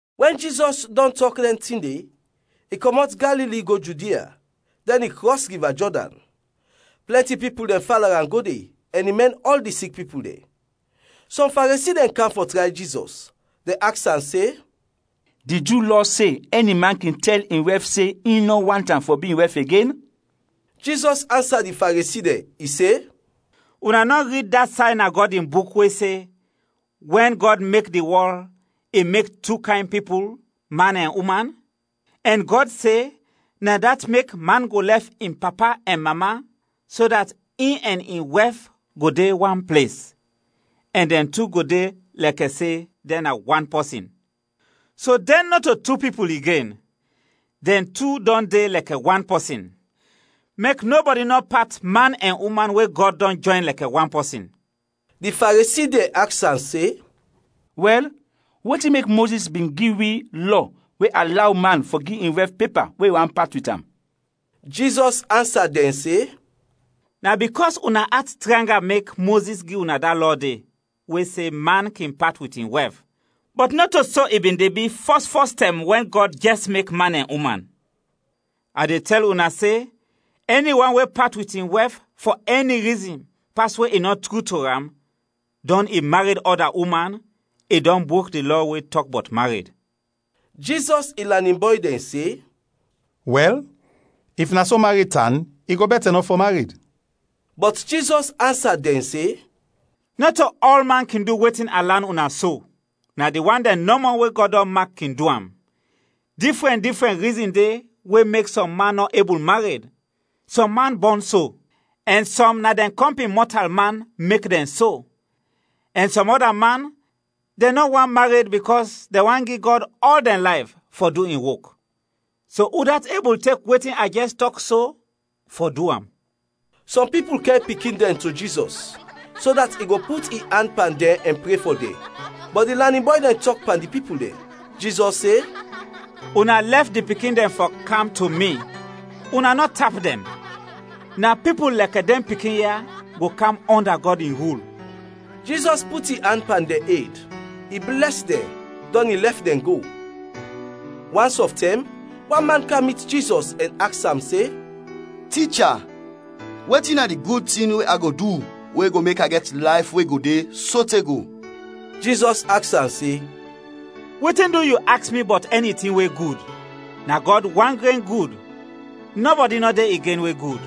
Wɛn Jizɔs dɔn tɔk dɛn tin de, i kɔmɔt Galili go Judia, dɛn i krɔs Riva Jɔdan. Plɛnti pipul dɛn fala am go de, ɛn i mɛn ɔl di sik pipul dɛn. Sɔm Faresi dɛn kam fɔ tray Jizɔs, dɛn aks am se, “Di Ju Lɔ se ɛni man kin tɛl in wɛf se in nɔ want am fɔ bi in wɛf igen?” Jizɔs ansa di Faresi dɛn, i se, “Una nɔ rid da say na Gɔd in Buk we se, wɛn Gɔd mek di wɔl, i mek tu kayn pipul, man ɛn uman? Ɛn Gɔd se, ‘Na dat mek man go lɛf in papa ɛn mama, so dat in ɛn in wɛf go de wan ples, ɛn dɛn tu go de lɛkɛ se dɛn na wan pɔsin.’ So dɛn nɔto tu pipul igen, dɛn tu dɔn de lɛkɛ wan pɔsin. Mek nɔbɔdi nɔ pat man ɛn uman we Gɔd dɔn jɔyn lɛkɛ wan pɔsin.” Di Faresi dɛn aks am se, “Wɛl, wetin mek Mozis bin gi wi lɔ we alaw man fɔ gi in wɛf pepa we i want pat wit am?” Jizɔs ansa dɛn se, “Na bikɔs una at tranga, mek Mozis bin gi una da lɔ de we se man kin pat wit in wɛf, bɔt nɔto so i bin de bi fɔs fɔs tɛm wɛn Gɔd jɛs mek man ɛn uman. A de tɛl una se: ɛni wan we pat wit in wɛf fɔ ɛni rizin pas we i nɔ tru to am, dɔn i mared ɔda uman, i dɔn brok di lɔ we tɔk bɔt mared.” Jizɔs in lanin bɔy dɛn se, “Wɛl, if na so mared tan, i go bɛtɛ nɔ fɔ mared.” Bɔt Jizɔs ansa dɛn se, “Nɔto ɔlman kin du wetin a lan una so, na di wan dɛn nɔmɔ we Gɔd dɔn mak kin du am. Difrɛn difrɛn rizin de we mek sɔm man nɔ ebul mared: sɔm man bɔn so; ɛn sɔm na dɛn kɔmpin mɔtalman mek dɛn so; ɛn sɔm ɔda man dɛn nɔ want mared bikɔs dɛn want gi Gɔd ɔl dɛn layf fɔ du in wok. So udat ebul tek wetin a jɛs tɔk so, fɔ du am.” Sɔm pipul kɛr pikin dɛn to Jizɔs, so dat i go put in an pan dɛn ɛn pre fɔ dɛn. Bɔt di lanin bɔy dɛn tɔk pan di pipul dɛn. Jizɔs se, “Una lɛf di pikin dɛn fɔ kam to mi; una nɔ tap dɛn, na pipul lɛkɛ dɛn pikin ya go kam ɔnda Gɔd in rul.” Jizɔs put in an pan dɛn ed, i blɛs dɛn, dɔn i lɛf dɛn go. Wans ɔf tɛm, wan man kam mit Jizɔs ɛn aks am se, “Ticha, wetin na di gud tin we a go du we go mek a gɛt layf we go de sote go?” Jizɔs aks am se, “Wetin du yu aks mi bɔt ɛni tin we gud? Na Gɔd wan gren gud, nɔbɔdi nɔ de igen we gud.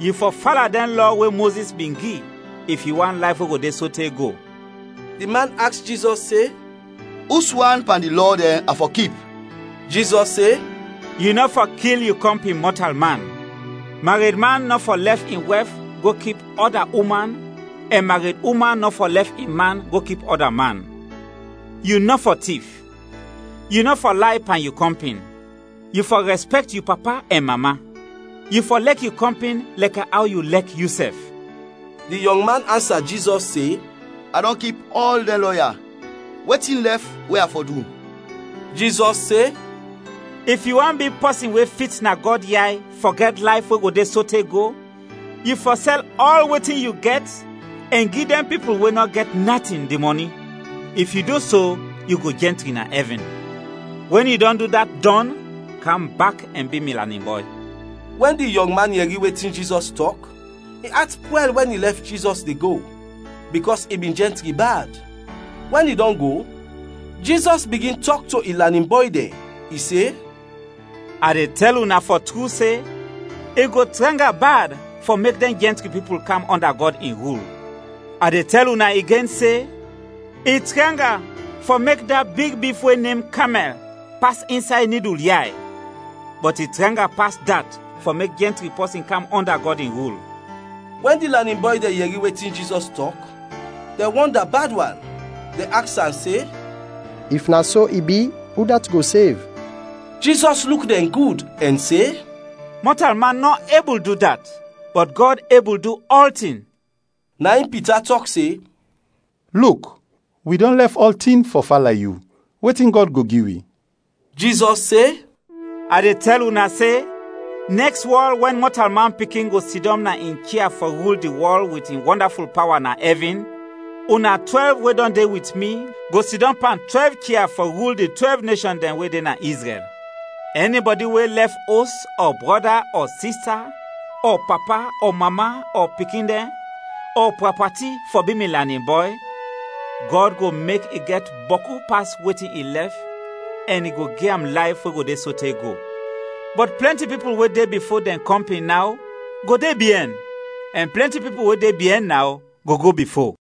Yu fɔ fala dɛn lɔ we Mozis bin gi, if yu want layf we go de sote go.” Di man aks Jizɔs se, “Uswan pan di lɔ dɛn a fɔ kip?” Jizɔs se, “Yu nɔ fɔ kil yu kɔmpin mɔtalman; maredman nɔ fɔ lɛf in wɛf go kip ɔda uman ɛn mareduman nɔ fɔ lɛf in man go kip ɔda man; yu nɔ fɔ tif; yu nɔ fɔ lay pan yu kɔmpin; yu fɔ rɛspɛkt yu papa ɛn mama; yu fɔ lɛk yu kɔmpin lɛkɛ aw yu lɛk yusɛf.” Di yɔngman ansa Jizɔs se, “A dɔn kip ɔl dɛn lɔ ya. Wetin lɛf we a fɔ du?” Jizɔs se, “If yu want bi pɔsin we fit na Gɔd yay fɔ gɛt layf we go de sote go, yu fɔ sɛl ɔl wetin yu gɛt ɛn gi dɛn pipul we nɔ gɛt natin, di mɔni; if yu du so, yu go jɛntri na ɛvin. Wɛn yu dɔn du dat dɔn, kam bak ɛn bi mi lanin bɔy.” Wɛn di yɔngman yɛri wetin Jizɔs tɔk, in at pwɛl wɛn i lɛf Jizɔs de go, bikɔs i bin jɛntri bad. Wɛn i dɔn go, Jizɔs bigin tɔk to in lanin bɔy dɛn, i se, “A de tɛl una fɔ tru se, i go tranga bad fɔ mek dɛn jɛntri pipul kam ɔnda Gɔd in rul. A de tɛl una igen se, i tranga fɔ mek da big bif we nem kamɛl pas insay nidul yay, bɔt i tranga pas dat fɔ mek jɛntri pɔsin kam ɔnda Gɔd in rul.” Wɛn di lanin bɔy dɛn yɛri wetin Jizɔs tɔk, dɛn wɔnda bad wan; dɛn aks am se, “If na so i bi, udat go sev?” Jizɔs luk dɛn gud ɛn se, “Mɔtalman nɔ ebul du dat, bɔt Gɔd ebul du ɔltin.” Na in Pita tɔk se, “Luk, wi dɔn lɛf ɔltin fɔ fala yu. Wetin Gɔd go gi wi?” Jizɔs se, “A de tɛl una se, nɛks wɔl wɛn Mɔtalman Pikin go sidɔm na in chia fɔ rul di wɔl wit in wɔndaful pawa na ɛvin, una twɛlv we dɔn de wit mi, go sidɔm pan twɛlv chia fɔ rul di twɛlv neshɔn dɛn we de na Izrɛl. Ɛnibɔdi we lɛf os, ɔ brɔda, ɔ sista, ɔ papa, ɔ mama, ɔ pikin dɛn, ɔ prɔpati fɔ bi mi lanin bɔy, Gɔd go mek i gɛt bɔku pas wetin i lɛf ɛn i go gi am layf we go de sote go. Bɔt plɛnti pipul we de bifo dɛn kɔmpin naw, go de biɛn; ɛn plɛnti pipul we de biɛn naw, go go bifo.